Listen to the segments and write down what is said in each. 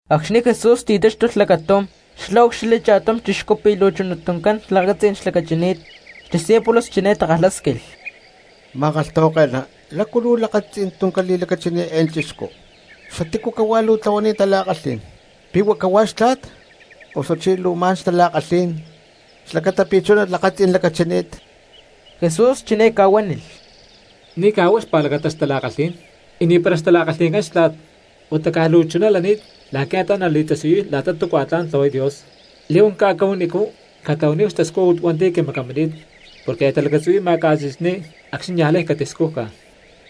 Acxni̠ Jesús ti̠táxtulh lacatum xlá úcxilhli cha̠tum chixcú pi̠ luu chuná tuncán lakatzí̠n xlacachini̠t. Xdiscípulos chiné takalhásquilh: —Ma̠kalhtahuake̠ná, ¿lácu luu lakatzí̠n tuncán li̠lacachini̠t eé chixcú? ¿Xatícu cahuá luu tlahuani̠t tala̠kalhí̠n? ¿Pi̠ huá cahuá xtla̠t osuchí luu ma̠n xtala̠kalhí̠n xlacata pi̠ chuná lakatzí̠n lacachini̠t? Jesús chiné ca̠huánilh: —Ni̠ caj huá xpa̠lacata xtala̠kalhí̠n, y ni̠para xtala̠kalhi̠ncán xtla̠t, huata caj luu chuná lani̠t la̠quí antá nali̠tasiyuy la̠ta túcua tla̠n tlahuay Dios. Li̠huán ca̠cuhuinicú catlahuaníhu xtascújut hua̠nti̠ quimacamini̠t, porque aya talacatzuhui̠ma ca̠tzi̠sní acxni̠ niaj lay catiscujca.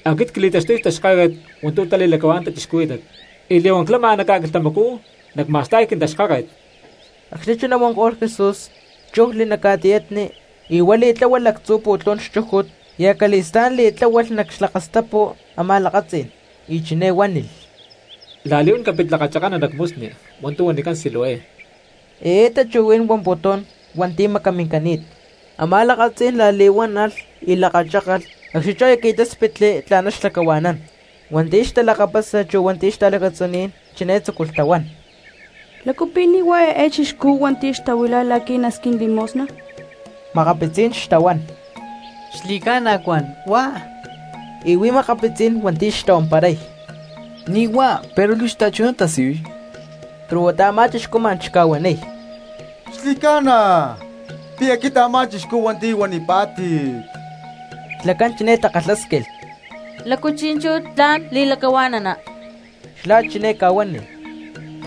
Aquit cli̠taxtuy taxkáket hua̠ntu̠ tali̠lacahua̠nán cristianos, y li̠huán clama nac ca̠quilhtamacú nacma̠sta̠y quintaxkáket. Acxni̠ chuná huanko̠lh Jesús chujli nac ca̠tiyatni y huá li̠tláhualh actzu̠ pu̠tlú̠n xchújut, y acali̠stá̠n li̠lacatláhualh nac xlakastapu a̠má lakatzí̠n. Y chiné huánilh: —La̠li̠huán capit lakachakana nac musni hua̠ntu̠ huanicán Siloé —eé tachuhuí̠n huamputún: Hua̠nti̠ macamincani̠t. Amá lakatzí̠n la̠li̠huán alh y lakachákalh; acxni̠ chú aya qui̠táspitli, tla̠ná xlacahua̠nán. Hua̠nti̠ xtalakapasa chu hua̠nti̠ xta̠lacatzuní̠n chiné tzúculh tahuán: —¿Lácu pi̠ ni̠ huá eé chixcú hua̠nti̠ xtahuilay la̠qui̠ nasquín limosna? Makapitzí̠n xtahuán: —Xli̠ca̠na cuan, huá. Y huí makapitzí̠n hua̠nti̠ xtahuamparay: —Ni̠ huá, pero luu xta̠chuná tasiyuy. Pero huata a̠má chixcú ma̠n xca̠huaniy: —Xli̠ca̠na pi̠ aquit a̠má chixcú hua̠nti̠ huanipá̠tit. Xlacán chiné takalhásquilh: —¿Lácu chi̠nchú tla̠n li̠lacahua̠nana? Xlá chiné ca̠huánilh: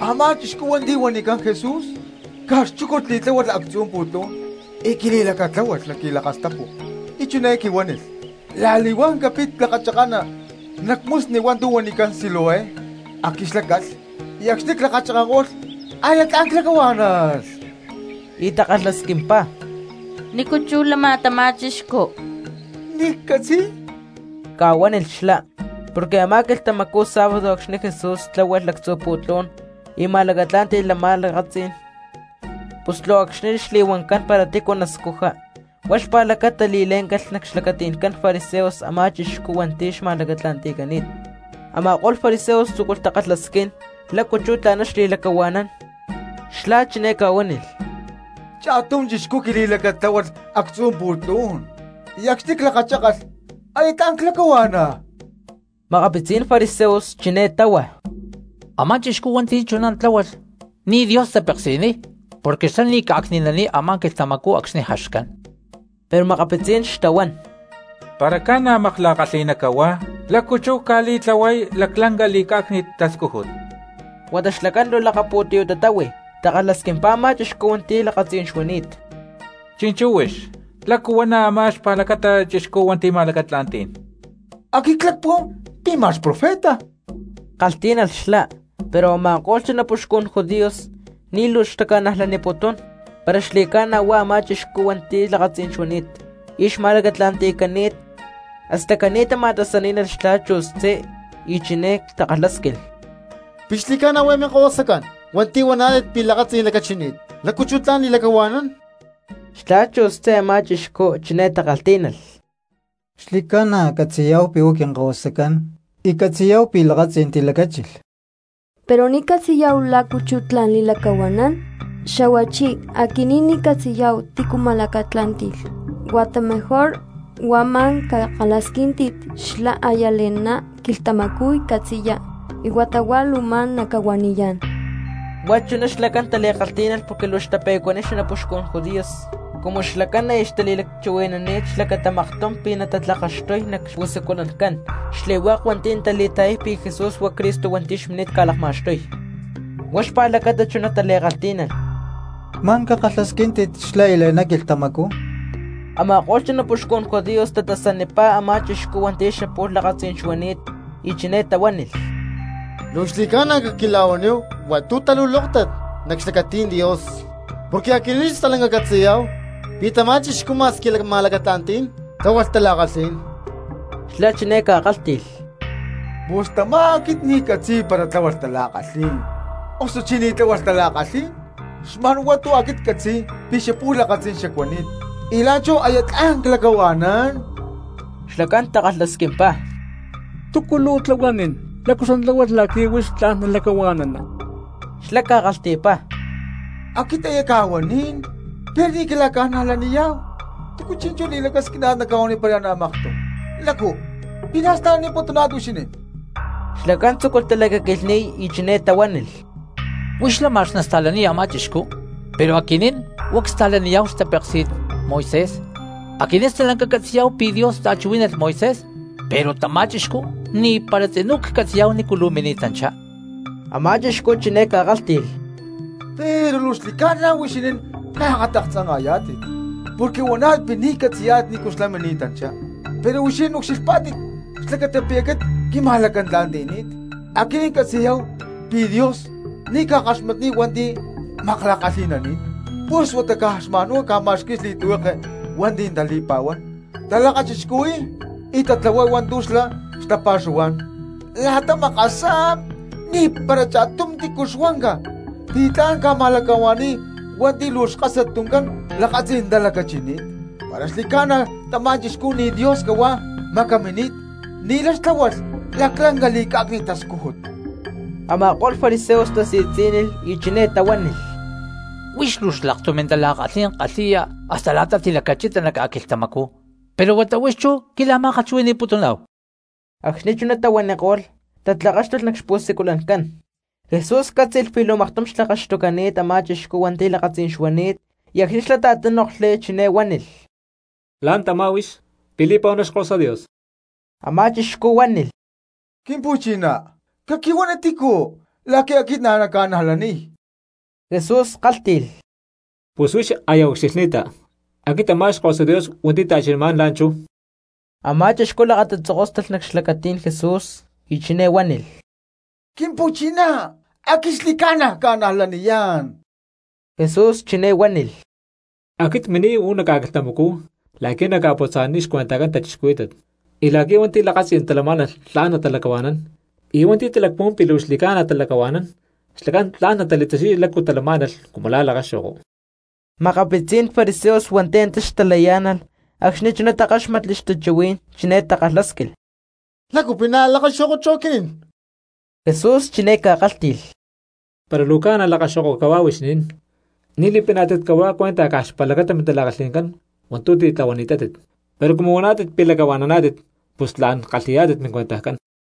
—Amá chixcú hua̠nti̠ huanicán Jesús caj xchújut li̠tláhualh actzu̠ pu̠tlú̠n y quili̠lacatláhualh nac quilakastapu y chiné quihuánilh: “La̠li̠huán capit lakachakana nac musni hua̠ntu̠ huanicán Siloé.” Aquit xlá calh y acxni̠ clakachakanko̠lh aya tla̠n clacahuá̠nalh. Y takalhasquimpá: —¿Nícu chú lama tamá chixcú? —Ni̠ ccatzi̠y —ca̠huánilh xlá. Porque a̠má quilhtamacú sábado acxni̠ Jesús tláhualh actzu̠ pu̠tlú̠n y ma̠lacatlá̠nti̠lh a̠má lakatzí̠n pus luu acxni̠ xli̠huancán para tícu nascuja, huá xpa̠lacata li̠lé̠ncalh nac xlacati̠ncán fariseos a̠má chixcú hua̠nti̠ xma̠lacatla̠nti̠cani̠t. Ama̠ko̠lh fariseos tzúculh takalhasquín lácu chú tla̠ná xli̠lacahua̠nán. Xlá chiné ca̠huánilh: —Cha̠tum chixcú quili̠lacatláhualh actzu̠ pu̠tlú̠n, y acxni̠ clakachákalh la̠nchú aya tla̠n clacahua̠nán. Makapitzí̠n fariseos chiné tahua: —Amá chixcú hua̠nti̠ chuná tláhualh ni̠ Dios tapeksi̠niy porque xlá ni̠ ca̠cni̠naniy a̠má quilhtamacú acxni̠ jaxcán. Pero makapitzí̠n xtahuán: —Para ca̠na makla̠kalhi̠ná cahuá, ¿lácu chú ca̠li̠tlahuay laclanca li̠cá̠cni̠t tascújut? Huata xlacán luu lakapu̠tiyú̠ tatahui. Kalhasquimpá a̠má chixcú hua̠nti̠ lakatzí̠n xuani̠t: —Chi̠nchú huix, ¿lácu huana xpa̠lacata a̠má chixcú hua̠nti̠ ma̠lacatla̠ntí̠n? —Aquit clacpuhuán pi̠ ma̠x profeta —kalhtí̠nalh xlá. Pero a̠ma̠ko̠lh xanapuxcun judíos ni̠ luu xtaca̠najlaputún para xli̠ca̠na huá a̠má chixcú hua̠nti̠ lakatzí̠n xuani̠t y xma̠lacatla̠nti̠cani̠t; hasta caní tama̠tasaní̠nalh xtla̠t chu xtzí y chiné takalhásquilh: —¿Pi̠ xli̠ca̠na huá eé minkahuasacán hua̠nti̠ huaná̠tit pi̠ lakatzí̠n lacachini̠t? ¿Lácu chú tla̠ná li̠lacahua̠nán? Xtla̠t chu xtzí a̠má chixcú chiné takalhtí̠nalh: —Xli̠ca̠na ccatzi̠yá̠hu pi̠ huá quinkahuasacán y ccatzi̠yá̠hu pi̠ lakatzí̠n tilacáchilh. Pero ni̠ ccatzi̠yá̠hu lácu chú tla̠n li̠lacahua̠nán, xa̠huachí aquinín ni̠ ccatzi̠yá̠hu tícu ma̠lacatlá̠nti̠lh. Huata mejor huá ma̠n cakalhasquíntit. Xlá aya le̠ná̠hu quilhtamacú y catzi̠yá, y huata huá luu ma̠n naca̠huaniyá̠n. Huá chuná xlacán tali̠kalhtí̠nalh porque luu xtape̠cuaniy xanapuxcun judíos, cumu xlacán aya xtali̠lacchuhui̠nani̠t xlacata maktum pi̠ natatlakaxtuy nac xpu̠siculancán xli̠hua̠k hua̠nti̠ natali̠ta̠yay pi̠ Jesús huá Cristo hua̠nti̠ xmini̠t ca̠lakma̠xtuy. Huá xpa̠lacata chuná tali̠kalhtí̠nalh: “Ma̠n cakalhasquíntit; xlá aya le̠ná̠hu quilhtamacú.” Ama̠ko̠lh xanapuxcun judíos tatasanipá a̠má chixcú hua̠nti̠ xapu̠lh lakatzí̠n xuani̠t, y chiné tahuánilh: —Luu xli̠ca̠na caquila̠huaníhu hua̠ntu̠ talulóktat nac xlacatí̠n Dios, porque aquinín stalanca ccatzi̠yá̠hu pi̠ tamá chixcú, ma̠squi ma̠lacatla̠ntí̠n tláhualh tala̠kalhí̠n. Xlá chiné ca̠kálhti̠lh: —Pus tamá aquit ni̠ ccatzi̠y para tláhualh tala̠kalhí̠n osuchí ni̠ tláhualh tala̠kalhí̠n. Xma̠n hua̠ntu̠ aquit ccatzi̠y pi̠ xapu̠lh lakatzí̠n xacuani̠t y la̠nchú aya tla̠n clacahua̠nán. Xlacán takalhasquimpá: —¿Túcu luu tlahuanín? ¿Lácu xlá tláhualh la̠qui̠ huix tla̠n nalacahua̠nana? Xlá ca̠kalhti̠pá: —Aquit aya cca̠huanín pero ni̠ quila̠ca̠najlaniyá̠hu. ¿Túcu chi̠nchú li̠lacasquiná̠tit nacuamparay a̠maktum? ¿Lácu pi̠ na̠ sta̠laniputuná̠tit huixinín? Xlacán tzúculh talacaquilhni̠y y chiné tahuánilh: —Huix xlá ma̠x nasta̠laniya a̠má chixcú, pero aquinín huá csta̠laniyá̠hu xtapéksi̠t Moisés. Aquinín stalanca ccatzi̠yá̠hu pi̠ Dios tita̠chuhuí̠nalh Moisés; pero tamá chixcú ni̠para tzinú ccatzi̠yá̠hu nícu luu mini̠tanchá. Amá chixcú chiné ca̠kálhti̠lh: —Pero luu xli̠ca̠na huixinín mákat aktzanka̠yá̠tit porque huaná̠tit pi̠ catzi̠yá̠tit nícu xlá mini̠tanchá, pero huixinín ucxilhpá̠tit xlacata pi̠ aquit quima̠lacatla̠nti̠ni̠t. Aquinín catzi̠yá̠hu pi̠ Dios ni̠ ca̠kaxmatniy hua̠nti̠ makla̠kalhi̠naní̠n, pus huata caj xma̠nhuá ca̠ma̠xqui̠y xli̠tlihueke hua̠nti̠ tali̠pa̠huán, talakachixcuhui̠y y tatlahuay hua̠ntu̠ xlá xtapa̠xuhuá̠n. La̠ta maka̠sá ni̠para cha̠tum tícu xuanca pi̠ tla̠n ca̠ma̠lacahua̠ni̠y hua̠nti̠ luu xkásat tuncán lakatzí̠n xlacachini̠t. Para xli̠ca̠na tamá chixcú ni̠ Dios cahuá macamini̠t ni̠lay xtláhualh laclanca li̠cá̠cni̠t tascújut. Ama̠ko̠lh fariseos tasi̠tzí̠nilh y chiné tahuánilh: —¡Huix luu xlakstu mintala̠kalhí̠n kalhi̠ya hasta la̠ta tilacachita nac ca̠quilhtamacú; pero huata huix chú quila̠ma̠kalhchuhui̠ni̠putuná̠hu! Acxni̠ chuná tahuaniko̠lh tatlakáxtulh nac xpu̠siculancán. Jesús cátzi̠lh pi̠ luu maktum xtlakaxtucani̠t a̠má chixcú hua̠nti̠ lakatzí̠n xuani̠t; y acxni̠ xlá ta̠tánoklhli chiné huánilh: —La̠ntamá huix, ¿pi̠ li̠pa̠huana Xkahuasa Dios? Amá chixcú huánilh: —Quimpu̠chiná, caquihuani tícu la̠qui̠ aquit nacca̠najlaniy. Jesús kálhti̠lh: —Pus huix aya ucxilhni̠ta, aquit a̠má Xkahuasa Dios hua̠nti̠ ta̠chuhui̠namá̠n la̠nchú. Amá chixcú lakatatzokóstalh nac xlacatí̠n Jesús y chiné huánilh: —Quimpu̠chiná, aquit xli̠ca̠na cca̠najlaniyá̠n. Jesús chuná huánilh: —Aquit cmini̠t uú nac ca̠quilhtamacú la̠qui̠ nacca̠putza̠naniy xcuentajcán cristianos, y la̠qui̠ hua̠nti̠ lakatzí̠n talamá̠nalh tla̠n natalacahua̠nán, y hua̠nti̠ talacpuhuán pi̠ luu xli̠ca̠na talacahua̠nán xlacán tla̠n nali̠tasiyuy lácu talamá̠nalh cumu la̠ lakaxo̠ko. Makapitzí̠n fariseos hua̠nti̠ antá xtalayá̠nalh acxni̠ chuná takáxmatli xtachuhuí̠n chiné takalhásquilh: —¿Lácu pi̠ na̠ lakaxo̠ko chú aquinín? Jesús chiné ca̠kálhti̠lh: —Para luu ca̠na lakaxo̠ko cahuá huixinín, ni̠ li̠piná̠tit cahuá cuenta caj xpa̠lacata mintala̠kalhi̠ncán hua̠ntu̠ titlahuani̠tátit, pero cumu huaná̠tit pi̠ lacahua̠naná̠tit pus la̠n kalhi̠yá̠tit mincuentajcán.